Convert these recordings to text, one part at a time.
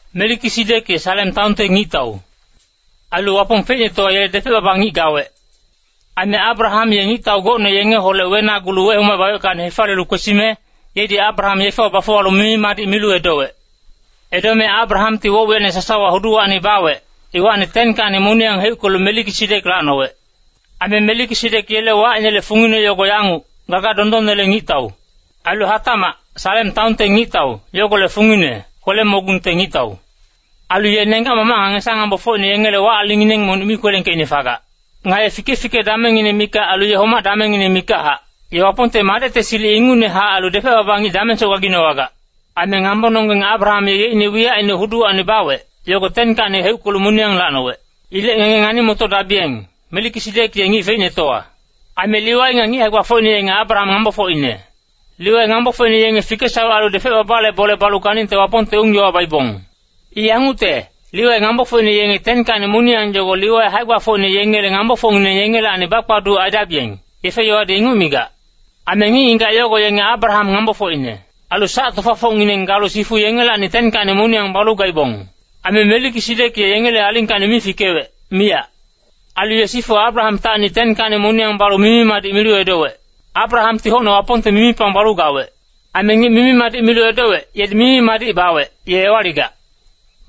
Melikisidek ye Salem taonte ngictau. Ailu Wapong feicnetowa yele depec-baba ngic gawec. Aime Abraham ye ngictau gocne yengeholec wenagulu wehomacebaweckacni hefaliyelu kwesime, yedi Abraham yefewa bafuwalu mimi-madic milu edowec. Edome Abrahamti woc-wiyacine sasawa huduwacni bawec, iwacni 10kacni moniyang heuckelu Melikisidek lacnowec. Aime Melikisidek yele wacinele fungine yogo yanguc, “Gaga dondonnele ngictau.” Ailu hatacmac “Salem taonte ngictau” yogolec fungine “kwele-mogungte ngictau.” Ailu ye nenggac-mamac nga ngesa-ngambofocine yengele wac-alingngineng monic mi kwelengkeicne fagac. Nga ye fike-fike damengngine mikac ailu ye homac damengngine mikachac, ye Wapongte Madecte silic ingucnehac ailu depec-baba ngic damengsoc gaginowagac. Aime ngambononggeng Abraham ye yeicne wiyacine huduwacni bawec, yogo 10kacni heuckelu moniyang lacnowec. Ilec ngenge ngani-motodabiyeng, Melikisidek ye ngic feicnetowa. Aime Liwai nga ngic hae-gbafocine yenge Abraham ngambofocine. Liwai ngambofocine yenge fikesawec ailu depec-babale bole balu ganingte Wapongte ung-yowa baibong. I yangucte, Liwai ngambofocine yenge 10kacni moniyang yogo Liwai hae-gbafocine yengele ngambofocngineng yengelacni bakpaduc aidabiyeng, yefe-yowadi inguc migac. Aime ngic-ngigac yogo yenge Abraham ngambofocine. Ailu sac-tofafocngineng galu sifu yengelacni 10kacni moniyang balu gaibong. Aime Melikisidek ye yengele alingkacni mi fikewec, miyac. Ailu ye sifu Abrahamtacni 10kacni moniyang balu mimi-madic milu edowec. Abrahamti hocne Wapongte mimipang balu gawec. Aime ngic mimi-madic milu edowec, yedi mimi-madic bawec, ye ewaligac.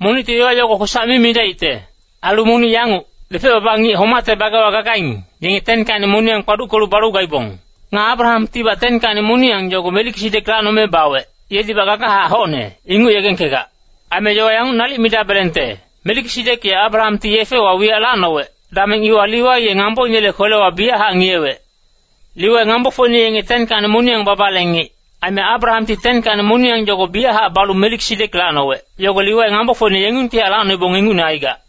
Monicti yowa yogo kwesac mi midaicte. Ailu monic yanguc, depec-baba ngic homacte bagewa gagaing, yenge 10kacni moniyang kpaduckelu balu gaibong. Nga Abrahamtibac 10kacni moniyang yogo Melikisidek lacnome bawec, yedibac gagachac hocne, inguc yegengkegac. Aime yowa yanguc nalic midabelengte, Melikisidek ye Abrahamti yefewa wiyac lacnowec, dameng iwa Liwai ye ngamboinele kwelewa biyachac ngiyewec. Liwai ngambofocine yenge 10kacni moniyang babale ngic, aime Abrahamti 10kacni moniyang yogo biyachac balu Melikisidek lacnowec, yogo Liwai ngambofocine yengungtihac lacnoibong ingucne aigac.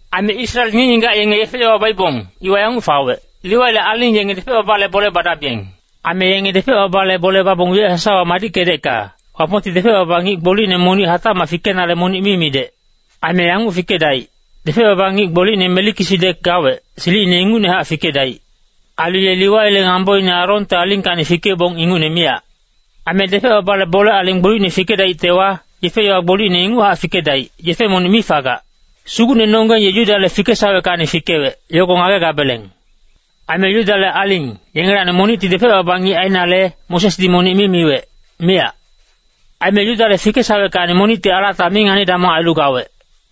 Aime Israel ngic-ngigac yenge yefe-yowa baibong, iwa yanguc fawec, Liwaile aling yenge depec-babale bole badabiyeng. Aime yenge depec-babale bole babong wiyac sasawa madickedecka, Wapongti depec-baba ngic gbolicne monic hatacmac fikenale monic mi midec. Aime yanguc fikedaic, depec-baba ngic gbolicne Melikisidek gawec, silicine ingucnehac fikedaic. Ailu ye Liwai ngamboine Aronte alingkacni fikeibong ingucne miyac. Aime depec-babale bole aling gbolicne fikedaictewa, yefe-yowa gbolicne inguchac fikedaic, yefe monic mi fagac. Sugucnenonggeng ye Yudale fikesaweckacni fikewec, yogo ngagegabeleng. Aime Yudale aling, yengelacni monicti depec-baba ngic ainale, Mosesdi monic mi miwec, miyac. Aime Yudale fikesaweckacni monicti alata mi ngani-damong ailu gawec.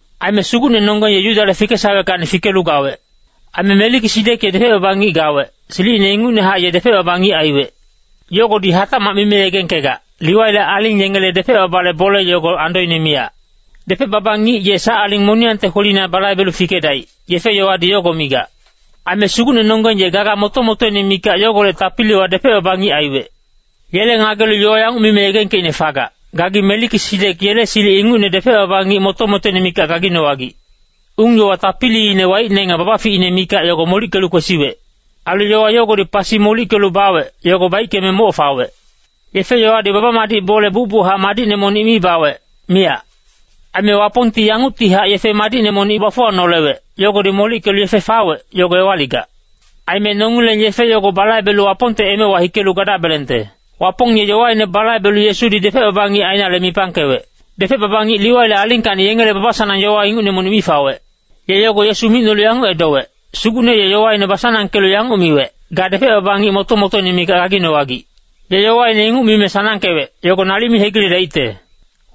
Aime Sugucnenonggeng ye Yudale fikesaweckacni fikelu gawec. Aime Melikisidek ye depec-baba ngic gawec, silicine ingucnehac ye depec-baba ngic aiwec. Yogodi hatacmac mime yegengkegac, Liwaile aling yengele depec-babale bole yogo andoine miyac. Depec-baba ngic ye sac aling moniyangte kwelina balaibelu fikedaic, yefe-yowadi yogo migac. Aime Sugucnenonggeng ye gaga moto-motoine mikac yogolec tapiliwa depec-baba ngic aiwec. Yele ngagelu yowa yanguc mime yegengkeicne fagac, “Gagi Melikisidek yele silic ingucne depec-baba ngic moto-motoine mikac gaginowagic.” Ung-yowa tapiliine waicne nga babaficine mikac yogo molickelu kwesiwec. Ailu yowa yogodi pasi molickelu bawec, yogo baickeme moc fawec. Yefe-yowadi baba-madic bole bucbuchac madicne monic mi bawec, miyac. Aime Wapongti yanguctihac yefe madicne monic bafuwanolewec, yogodi molickelu yefe fawec, yogo ewaligac. Aime nongileng yefe yogo balaibelu Wapongte emewa hikelu gadabelengte. Wapong ye yowaine basanangkelu Yesudi depec-baba ngic ainale mipangkewec. Depec-baba ngic Liwaile alingkacni yengele baba-sanang yowa ingucne monic mi fawec. Ye yogo Yesu micnolu yanguc edowec, “Sugucne ye yowaine basanangkelu yanguc miwec, ‘Ga depec-baba ngic moto-motoine mikac gaginowagic.’ Ye yowaine inguc mime sanangkewec, yogo nalic mi hegiledaicte.”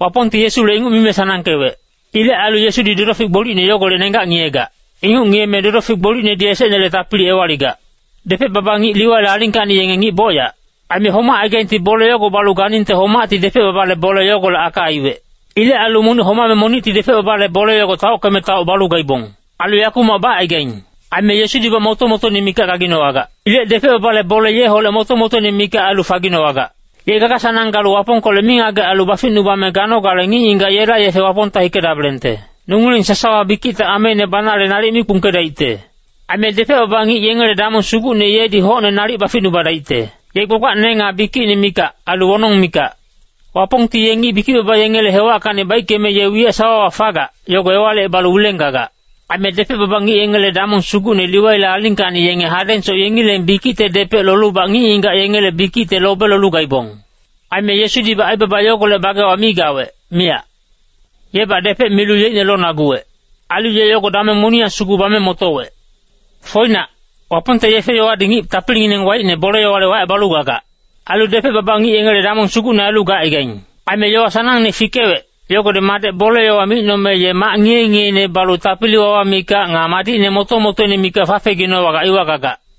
Wapongti Yesule inguc mime sanangkewec. Ilec ailu Yesudi dodofic gbolicne yogolec nenggac ngiyegac. Inguc ngiyeme dodofic gbolicnedi esecnele tapili ewaligac. Depec-baba ngic Liwaile alingkacni yenge ngic bocyac. Aime homacaigaingti bole yogo balu ganingte homacti depec-babale bole yogolec aka aiwec. Ilec ailu monic homame monicti depec-babale bole yogo taockeme taoc balu gaibong. Ailu yakumac bacaigaing. Aime Yesudibac moto-motoine mikac gaginowagac. Ilec depec-babale bole yeholec moto-motoine mikac ailu faginowagac. Ye gaga-sanang galu Wapongkolec mingagec ailu baficnubame ganogale ngic-ngigac yela yefe Wapongta hikedabelengte. Nongileng sasawa bikicte ameine banale nalic mi kpungkedaicte. Aime depec-baba ngic yengele damong sugucne yedi hocne nalic baficnubadaicte. Ye gbagbacne nga bikicine mikac, ailu wonong mikac. Wapongti ye ngic bikic-baba yengele hewackacni baickeme ye wiyac sawawa fagac, yogo ewalicebalu wileng gagac. Aime depec-baba ngic yengele damong sugucne Liwaile alingkacni yenge hadengsoc yengileng bikicte depec lolubac ngic-ngigac yengele bikicte lobe lolu gaibong. Aime Yesudibac aibaba yogolec bagewa mi gawec, miyac. Yebac depec milu yeicne lonaguwec. Ailu ye yogo dameng moniyang sugu bame motowec. Foinac, Wapongte yefe-yowadi ngic tapilingineng waicne bole-yowale wacebalu gagac. Ailu depec-baba ngic yengele damong sugucne ailu gacaigaing. Aime yowa sanangne fikewec, yogodi Madec bole-yowa micnome ye mac ngiye-ngiyeine balu tapili-wawa mikac nga madicne moto-motoine mikac fafeginowagac iwa gagac.